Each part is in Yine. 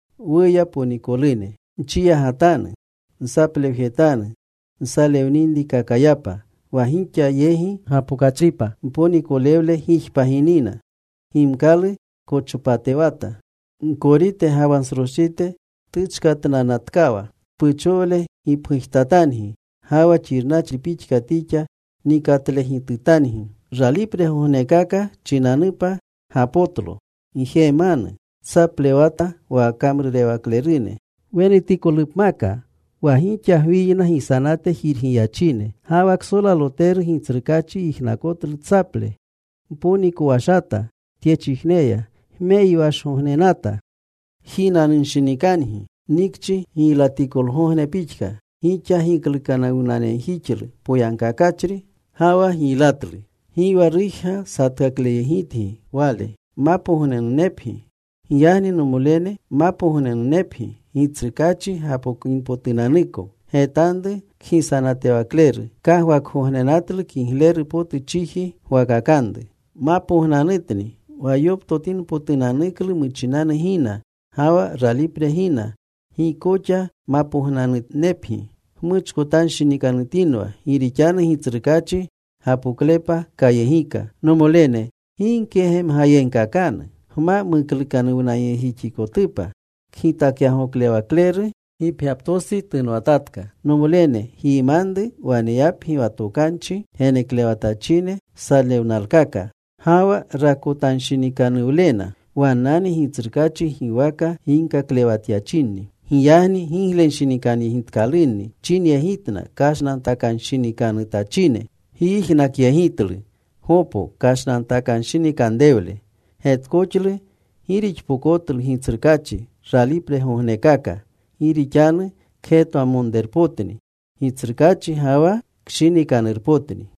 Wuya, ponikolune, nchiyagatanu. Nsaplewjetanu nsalewninrikakayapa wa gixa yegi gapokachripa. Mponikolewle gijpagiynina. Gimkalu kochopatewata. Gkorite ga wa nsroschite tuchkatnanatkawa. Tpuchowle gipgujtatangi ga wa xirnachri pixka tixa nikatlegitutangi. Ralipregognekaka chinanupa, gapotlo. Gjemanu: Tsaplewata wa kamrurewaklerune wenutikolupmaka, wa gixa gwiyna gisanate jirgiyachine. Ga wa ksolaloteru Gitsrukaachi yijnakotlu tsaple. Mponikowashata tyechijneya. Gmeyiwashgognenata. Jinanunshinikangi, nikchi giylatikolgogne pixka. Gixa giklukanuwnayegjixlu poyagkakachri, ga wa giylatlu. Gi wa rujga satkakleyegitgi wale. Giyagni, nomolene, mapognanunepgi Gitsrukaachi gapokinpotunanuko. Getanru kgisanatewakleru. Kagwakgognenatlu kigleru potu chiji gwakakanru. Mapognanutni wa yoptotinpotunanuklu muchinanu gina ga wa ralipre gina. Gixa koxa mapognanunepgi. Gmuchkotanshinikanutinwa. Gi rixanu Gitsrukaachi gapoklepa kayegika. Nomolene, gi gkegemgayegkakanu gma muklukanuwnayegjixikotupa. Kgitakyagoklewakleru gipgyaptostsi tunwanatatka. Nomolene, gyimanru waneyapgi wa tokanchi geneklewatachine salewnalkaka ga wa rakotanshinikanuwlena. Wannani Gitsrukaachi giwaka ginkaklewatyachinni. Giyagni giglenshinikanyegitkalunni wchinyegitna kashnantakanshinikanutachine. Gyijnakyegitlu Gopo kashnantakanshinikanrewle. Getkoxlu gi rixpokotlu Gitsrukaachi ralipregognekaka gi rixanu kgetwamonrerpotni Gitsrukaachi ga wa kshinikanurpotni.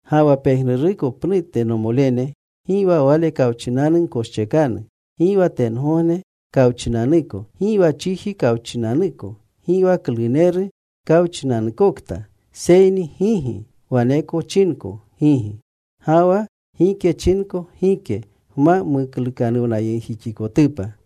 Ga wa pejnuruko pnute, nomolene, gi wa Wale kawchinanu gkoschekanu, gi wa tengogne kawchinanuko, gi wa chiji kawchinanuko, gi wa kluneru kawchinanukokta. Seyni gigi wane chinko gigi. Ga wa gike chinko gike, gma muklukanuwnayegjixikotupa.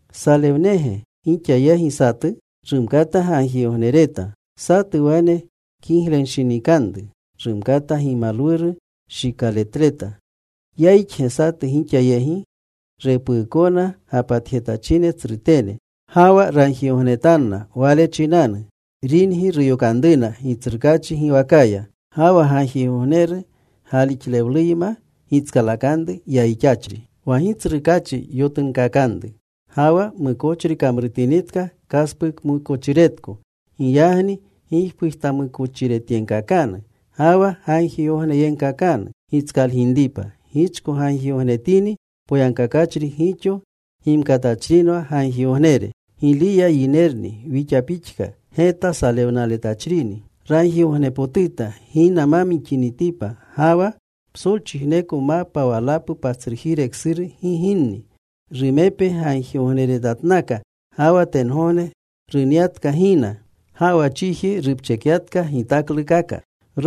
¿Salewnege gixa yegi satu? Rumkata gagjigognereta. ¿Satu wane kiglenshinikanuru? Rumkata gimalwuru shikaletleta. ¿Yayixge satu gixa yegi? Repuukona gapatjetachine tsrutene, ga wa ragjigognetanna wale chinanu. Ringi ruyokanruna Gitsrukaachi giwakaya. Ga wa gagjigogneru galixlewluyma gitskalakanru yayixachri. Wa Gitsrukaachi yotunkakanru. Ga wa mukochri kamrutinitka, kaspukmukochiretko. Giyagni gipgujtamukochiretyegkakanu, ga wa gagjigogneyegkakanu gitskalginripa. Gichko ragjigognetini poyagkakachri, gixo gimkatachrinwa ragjigognere. Giliya yinerni wixa pixka geta salewnaletachrini. Ragjigognepotuta gina ma mixinitipa. Ga wa psolchijneko mapa walapu patsrujire ksuru gi ginni. Rumepe gagjigogneretatnaka, ga wa tengogne runyatka gina. Ga wa chiji rupchekyatka gitaklukaka.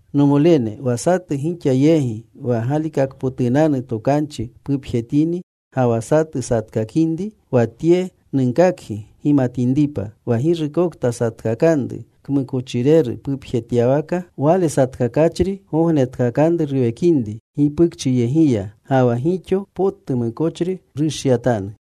Nomolene, wa satu gixa yegi wa galikakpotunanu tokanchi pupjetini, ga wa satu satkakinri, wa tye nunkakgi gimatinripa: Wa girukokta satkakanru kmukochireru pupjetyawakaya, wale satkakachri gognetkakanru ruwekinri gipukchiyegiya, ga wa gixo potu mukochri rushyatanu.